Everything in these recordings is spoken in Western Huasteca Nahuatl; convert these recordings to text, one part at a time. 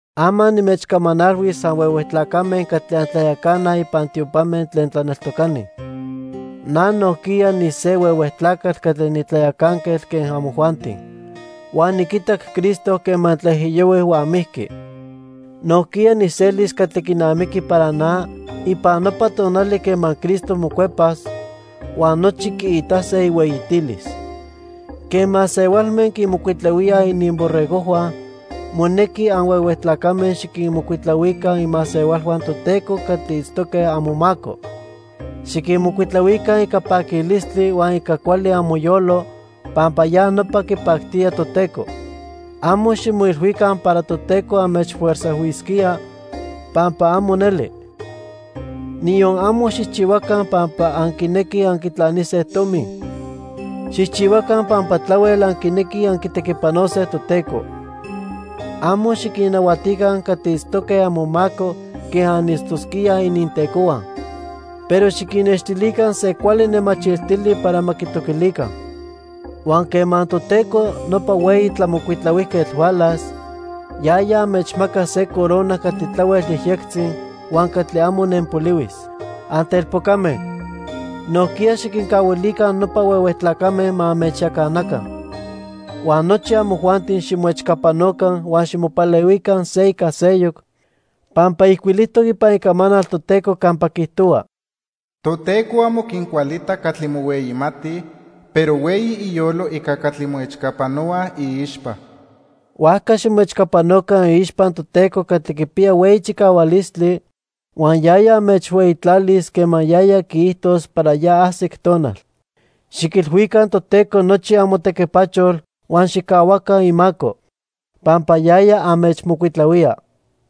Ama nimechcamanalhuis anhuehue tlacame catli antlayacanaj ipan tiopame tlen tlaneltocani. Na nojquiya nise huehue tlacatl catli nitlayacanquetl quen amojuanti. Huan niquitac Cristo quema tlaijiyohui huan mijqui. Nojquiya nijselis catli quinamiqui para na ipan nopa tonali quema Cristo mocuepas huan nochi quiitase ihueyitilis. Quen masehualme quinmocuitlahuíaj ininborregojhua, monequi anhuehue tlacame xiquinmocuitlahuica imasehualhua Toteco catli itztoque amomaco. Xiquinmocuitlahuica ica paquilistli huan ica cuali amoyolo, pampa ya nopa quipactía Toteco. Amo ximoilhuica para Toteco anmechfuerzajhuisquía, pampa amo neli. Niyon amo xijchihuaca pampa anquinequij anquitlanise tomi. Xijchihuaca pampa tlahuel anquinequij anquitequipanose Toteco. Amo xiquinnahuatica catli itztoque amomaco quen anitztosquíaj inintecohua. Pero xiquinnextilica se cuali nemachiltili para ma quitoquilica. Huan quema Toteco, nopa Hueyi Tlamocuitlahuijquetl hualas, yaya anmechmacas se corona catli tlahuel yejyectzi huan catli amo nenpolihuis. Antelpocame, nojquiya xiquincahuilica nopa huehue tlacame ma anmechyacanaca. Huan nochi amojuanti ximoechcapanoca huan ximopalehuica se ica seyoc pampa ijcuilijtoc ipan Icamanal Toteco campa quiijtohua: "Toteco amo quincualita catli mohueyimatij, pero hueyi iyolo ica catli moechcapanohuaj iixpa." Huajca ximoechcapanoca iixpa Toteco catli quipiya hueyi chicahualistli huan yaya anmechhueyitlalis quema yaya quiijtos para ya ajsic tonal. Xiquilhuica Toteco nochi amotequipachol huan xijcahuaca imaco, pampa yaya anmechmocuitlahuía.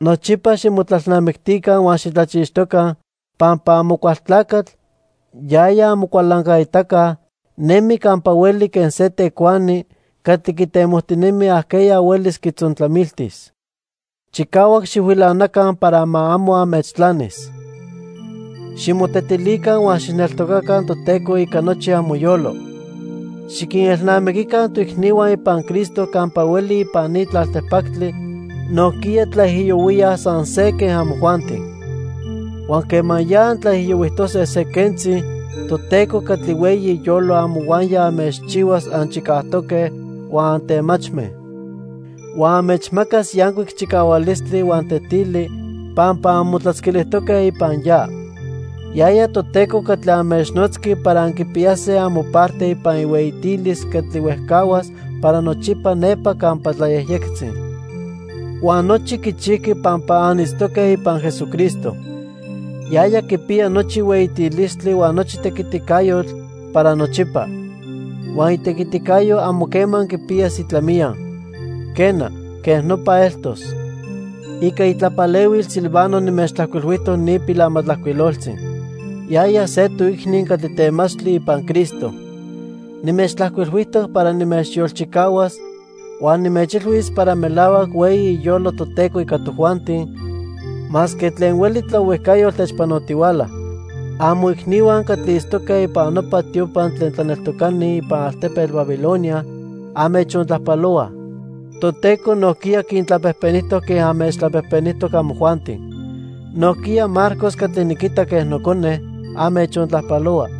Nochipa ximotlalnamictica huan xitlachixtoca, pampa Amocualtlacatl, yaya amocualancaitaca, nemi campa hueli quen se tecuani catli quitemojtinemi ajqueya huelis quitzontlamiltis. Chicahuac xijhuilanaca para ma amo anmechtlanis. Ximotetilica huan xijneltocaca Toteco ica nochi amoyolo. Xiquinelnamiquica toicnihua ipan Cristo campa hueli ipan ni tlaltipactli nojquiya tlaijiyohuíaj san se quen amojuanti. Huan quema ya antlaijiyohuijtose se quentzi, Toteco catli hueyi iyolo amohuaya anmechchihuas anchicajtoque huan antemachme. Huan anmechmacas yancuic chicahualistli huan tetili pampa anmotlatzquilijtoque ipan ya. Yaya Toteco catli anmechnotzqui para anquipiyase amoparte ipan ihueyitilis catli huejcahuas para nochipa nepa campa tlayejyectzi. Huan nochi quichijqui pampa anitztoque ipan Jesucristo. Yaya quipiya nochi hueyitilistli huan nochi tequiticayotl para nochipa. Huan itequiticayo amo quema quipiyas itlamiya. Quena, quej nopa eltos. Ica itlapalehuil Silvano nimechtlajcuilhuijtoc ni pilamatlajcuiloltzi. Yaya se toicni catli temachtli ipan Cristo. Nimechtlajcuilhuijtoc para nimechyolchicahuas huan nimechilhuis para melahuac hueyi iyolo Toteco ica tojuanti masque tlen hueli tlaohuijcayotl techpanotihuala. Amoicnihua catli itztoque ipan nopa tiopa tlen tlaneltocani ipan altepetl Babilonia anmechontlajpalohuaj. Toteco nojquiya quintlapejpenijtoc quen anmechtlapejpenijtoc amojuanti. Nojquiya Marcos catli niquita quen nocone, anmechontlajpalohua.